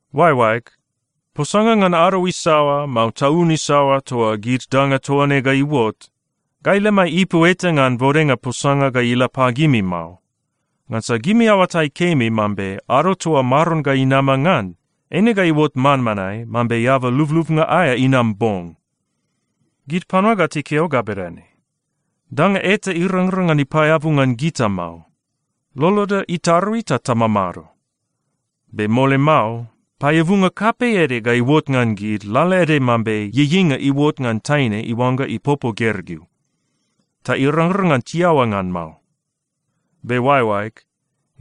Oaeoaeg, posanga ngan ado isaoa, mao taun isaoa toa gid danga toa ne ga iuot, gai lemai ipu eta ngan bodenga posanga ga ila pagimi mao. Ngansa gimi aoatai kemi mambe ado toa Maron ga inama ngan, eine ga iuot manmanae mambe eaba lublubnga aea inam bong. Gid panua ga tikeo ga bedane, “Danga eta irangrang ngan ipaeabu ngan gita mao. Loloda itarui ta tamamado.” Be mole mao, paeabunga kapei ede ga iuot ngan gid lalaede mambe ieieinga iuot ngan taine iuangga ipopo gergeu. Ta irangrang ngan tiaoa ngan mao. Be oaeoaeg,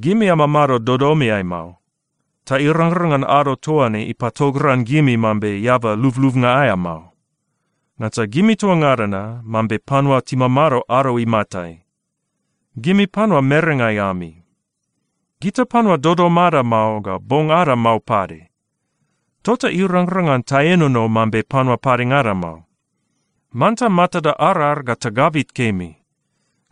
gimi amamado dodomeai mao, ta irangrang ngan ado toa ne ipatogran gimi mambe eaba lublubnga aea mao. Ngansa gimi toa ngada na mambe panua timamado ado imatai. Gimi panua merengai ami. Gita panua dodom ada mao ga bong ada mao pade. Tota irangrang ngan taenono mambe panua padengada mao. Manta matada arar ga tagabit kemi.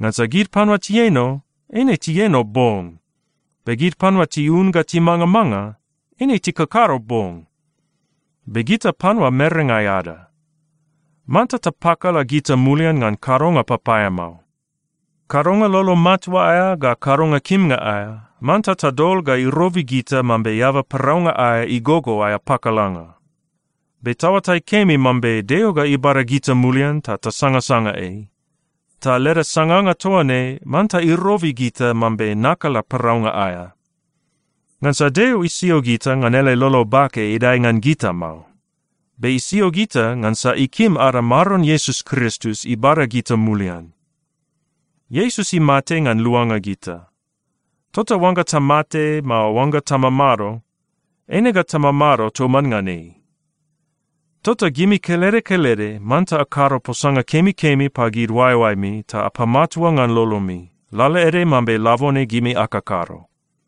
Ngansa gid panua tieno, eine tieno bong. Be gid panua tiun ga timangamanga, eine tikakado bong. Be gita panua merengai ada. Manta tapakala gita mulian ngan kadonga papaeamao. Kadonga lolo matua aea ga kadonga kimnga aea, manta tadol ga irobi gita mambe eaba paraunga aea igogo aea pakalanga. Be taoatai kemi mambe Deo ga ibada gita mulian ta tasangasanga ei. Ta leda sanganga toa ne manta irobi gita mambe nakala paraunga aea. Ngansa Deo isio gita ngan ele lolo bake idae ngan gita mao. Be isio gita ngansa ikim ada Maron Iesus Kristus ibada gita mulian. Iesus imate ngan luanga gita. Tota oangga tamate, mao oangga tamamado, eine ga tamamado toman ngan ei. Tota gimi kelede kelede manta akado posanga kemikemi pagid oaeoaemi ta apamatua ngan lolomi, lalaede mambe labone gimi akakado.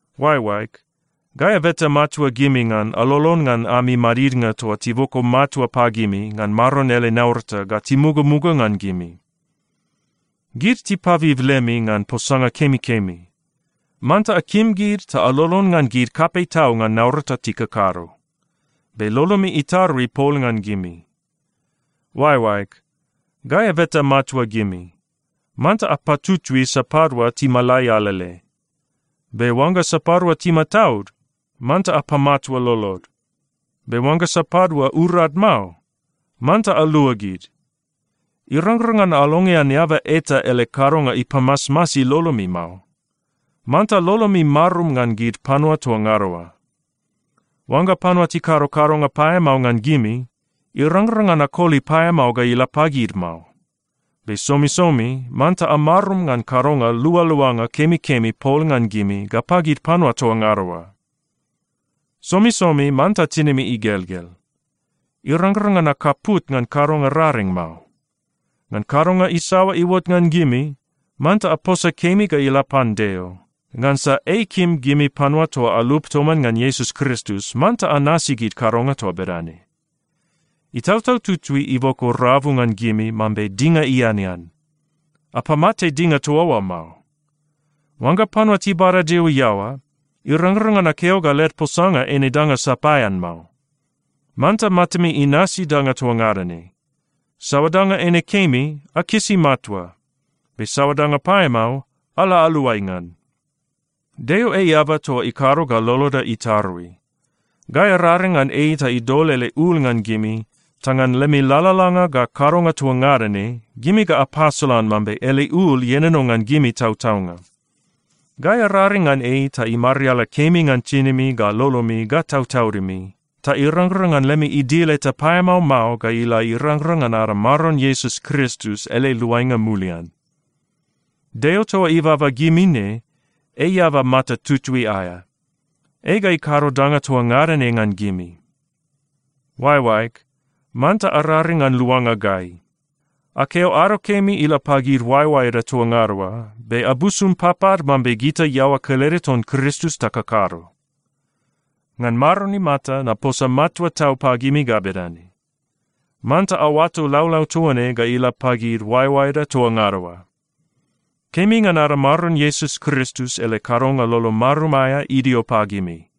Oaeoaeg, gai abeta matua gimi ngan alolon ngan ami madidnga toa tiboko matua pagimi ngan Maron ele naurata ga timugamuga ngan gimi. Gid tipabib lemi ngan posanga kemikemi. Manta akim gid ta alolon ngan gid kapei tau ngan naurata tikakado. Be lolomi itarui pol ngan gimi. Oaeoaeg, gai abeta matua gimi, manta apatutui sapadua timalai alele. Be oangga sapadua timataud, manta apamatua lolod. Be oangga sapadua urad mao, manta alua gid. Irangrang ngan alongean eaba eta ele kadonga ipamasmasi lolomi mao. Manta lolomi marum ngan gid panua toa ngada oa. Oangga panua tikado kadonga paeamao ngan gimi, irangrang ngan akoli paeamao ga ila pagid mao. Be somisomi manta amarum ngan kadonga lualuanga kemikemi pol ngan gimi ga pagid panua toa ngada oa. Somisomi manta tinimi igelgel. Irangrang ngan akaput ngan kadonga raring mao. Ngan kadonga isaoa iuot ngan gimi, manta aposa kemi ga ila pan Deo, ngansa ei ikim gimi panua toa alup toman ngan Iesus Kristus manta anasi gid kadonga toa bedane. Itautau Tutui iboko rabu ngan gimi mambe dinga ianean. Apamate dinga toa oa mao. Oangga panua tibada Deo iaoa, irangrang ngan akeo ga led posanga eine danga sapaean mao. Manta matami inasi danga toa ngada ne. Saoa danga eine kemi, akisi matua. Be saoa danga paeamao, ala aluai ngan. Deo ei eaba toa ikado ga loloda itarui. Gai araring ngan ei ta idol ele ul ngan gimi ta ngan lemi lalalanga ga kadonga toa ngada ne, gimi ga apasolan mambe ele ul ienono ngan gimi tautaunga. Gai araring ngan ei ta imariala kemi ngan tinimi ga lolomi ga tautaudimi, ta irangrang ngan lemi idil eta paeamao mao ga ila irangrang ngan ada Maron Iesus Kristus ele luainga mulian. Deo toa ibaba gimi ne, ei eaba mata tutui aea. Ei ga ikado danga toa ngada ne ngan gimi. Oaeoaeg, manta araring ngan luanga gai. Akeo “ado kemi” ila pagid oaeoaeda toa ngada oa be abusum papad mambe gita iaoa kelede ton Kristus takakado. Ngan Maron imata, naposa matua tau pagimi ga bedane: Manta aoato laulau toa ne ga ila pagid oaeoaeda toa ngada oa. Kemi ngan ada Maron Iesus Kristus ele kadonga lolo marum aea idio pagimi.